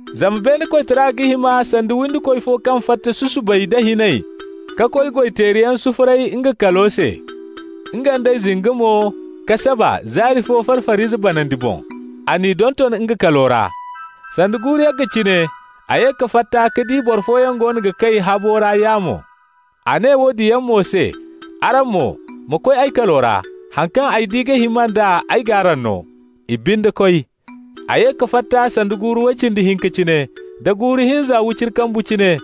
Zama beene koytara ga hima sanda windikoy fo kaŋ fatta susubay nda hinay ka koy goy-teeriyaŋ sufuray nga kalo se. Nga nd'ey zinga mo ka saba zaari fo far-far'ize banandi boŋ. A n'i donton nga kalo ra. Sanda guuru yagga cine a ye ka fatta ka di boro fooyaŋ goono ga kay habu ra yaamo. A ne woodin yaŋ mo se: ‹Araŋ mo, wa koy ay kalo ra. Haŋ kaŋ ay di ga hima nd'a, ay g'araŋ no.› I binde koy. A ye ka fatta sanda guuru way cindi hinka cine, da guuru hinza wiciri kambu cine,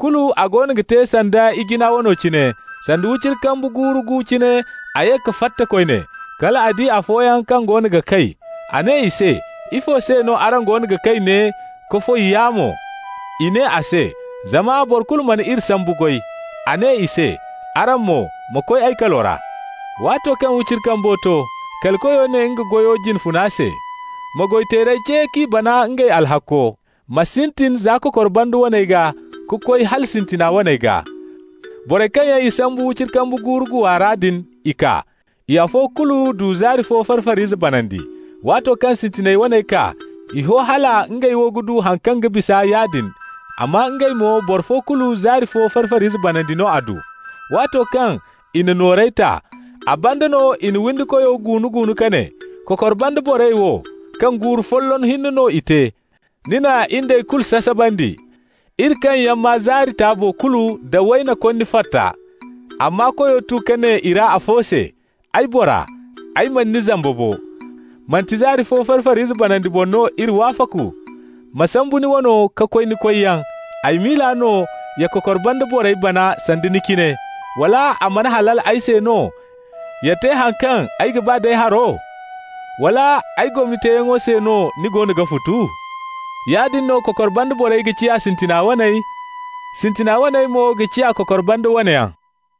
kulu a goono ga te sanda ijina wano cine. Sanda wiciri kambu guuru gu cine, a ye ka fatta koyne. Kal a di afooyaŋ kaŋ goono ga kay. A ne i se: ‹Ifo se no araŋ goono ga kay ne ka foy yaamo?› I ne a se: ‹Zama boro kulu mana iri sambu goy.› A ne i se: ‹Araŋ mo, ma koy ay kalo ra.› Waato kaŋ wiciri kambo to, kali koyo ne nga goyo jine funa se: ‹Ma goy-izey ce k'i bana ngey alhakko. Ma sintin za kokor banda waney gaa, ka koy hala sintina waney gaa.› Borey kaŋ yaŋ i sambu wiciri kambu guuru guwa ra din, i kaa. I afo kulu du zaari fo far-far'ize banandi. Waato kaŋ sintinay waney kaa, i ho hala ngey wo ga du haŋ kaŋ ga bisa yaadin, amma ngey mo boro fo kulu zaari fo far-far'ize banandi no a du. Waato kaŋ i na noorey ta, a banda no i na windikoyo guunu-guunu ka ne: ‹Kokor banda borey wo, kaŋ guuru folloŋ hinne no i te, ni na in d'ey kulu sasabandi, iri kaŋ yaŋ maa zaari taabo kulu da wayna konni forta.› Amma koyo tu ka ne i ra afo se: ‹Ay bora, ay mana ni zamba bo. Manti zaari fo far-far'ize banandi boŋ no iri wafaku? Ma sambu ni wano ka koy ni koyyaŋ. Ay miila no ya kokor banda borey bana sanda ni cine. Wala a mana halal ay se no ya te haŋ kaŋ ay ga ba d'ay haro? Wala ay gomni teeyaŋo se no ni goono ga futu?› Yaadin no kokor banda borey ga ciya sintina waney, sintina waney mo ga ciya kokor banda wane yaŋ.»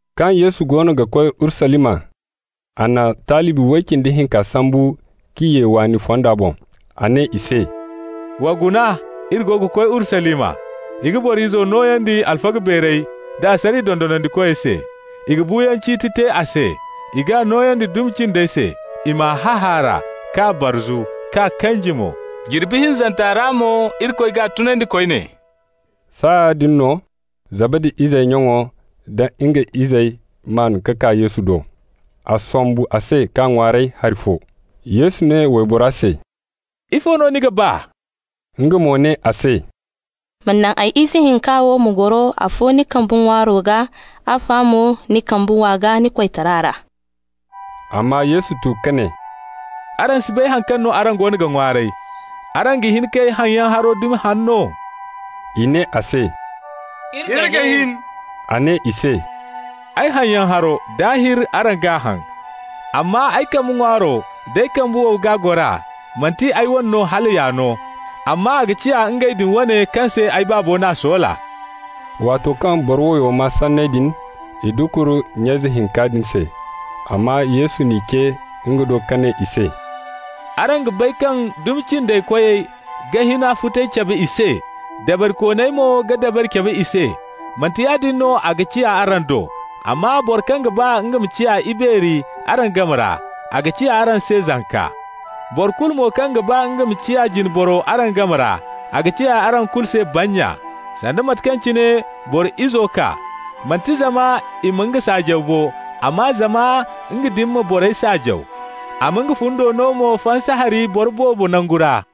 Kaŋ Yesu goono ga koy Urusalima, a na talibi way cindi hinka sambu k'i ye waani fonda boŋ. A ne i se: «Wa guna, iri goono ga koy Urusalima. I ga Boro Izo nooyandi alfaga beerey da asariya dondonandikoy se. I ga buuyaŋ ciiti te a se. I g'a nooyandi dumi cindey se, i m'a hahaara, k'a barzu, k'a kanji mo. Jirbi hinzanta ra mo Irikoy g'a tunandi koyne.» Saaya din no Zabadi izey nyaŋo nda nga izey maan ka kaa Yesu do. A sombu a se k'a ŋwaaray hari fo. Yesu ne waybora se: «Ifo no ni ga ba?» Nga mo ne a se: «Ma naŋ ay ize hinka wo ma goro afo ni kambe ŋwaaro gaa, afa mo ni kambe wow gaa ni koytara ra.» Amma Yesu tu ka ne: «Araŋ si bay haŋ kaŋ no araŋ goono ga ŋwaaray. Araŋ ga hin k'ay haŋyaŋ haro dumi haŋ no?» I ne a se: «Iri ga hin.» A ne i se: «Ay haŋyaŋ haro, daahir araŋ g'a haŋ. Amma ay kambe ŋwaaro d'ay kambe wow gaa gora, manti ay wane no hala y'a no, amma a ga ciya ngey din wane kaŋ se ay Baabo n'a soola.» Waato kaŋ boro wayo maa sanney din, i dukur nya ize hinka din se. Amma Yesu n'i ce nga do ka ne i se: «Araŋ ga bay kaŋ dumi cindey koyey ga hina futay cabe i se, dabarikooney mo ga dabari cabe i se. Manti yaadin no a ga ciya araŋ do, amma boro kaŋ ga ba nga ma ciya ibeeri araŋ game ra, a ga ciya araŋ se zanka. Boro kulu mo kaŋ ga ba nga ma ciya jine boro araŋ game ra, a ga ciya araŋ kulu se bannya. Sanda mate kaŋ cine Boro Izo kaa, manti zama i ma nga saajaw bo, amma zama nga din ma borey saajaw, a ma nga fundo no mo fansa hari boro boobo nangu ra.»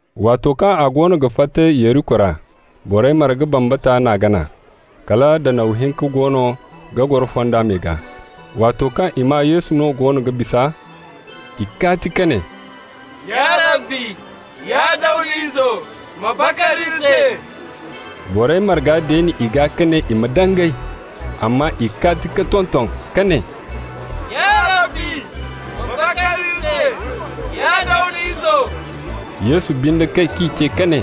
Waato kaŋ a goono ga fatta Yeriko ra, borey marga bambata n'a gana. Kala danaw hinka goono ga goro fonda me gaa. Waato kaŋ i maa Yesu no go ga bisa, i kaati ka ne: «Ya Rabbi, ya Dawda Izo, ma bakar iri se!» Borey marga deeni i gaa ka ne i ma dangay, amma i kaati ka tonton ka ne: «Ya Rabbi, ma bakar iri se, ya Dawda Izo!» Yesu binde kay k'i ce ka ne: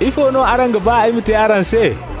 «Ifo no araŋ ga ba ay ma te araŋ se?»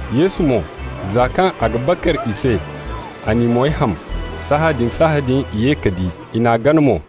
Yesu mo, za kaŋ a ga bakar i se, a n'i moy ham. Sahãadin-sahãadin i ye ka di, i n'a gana mo.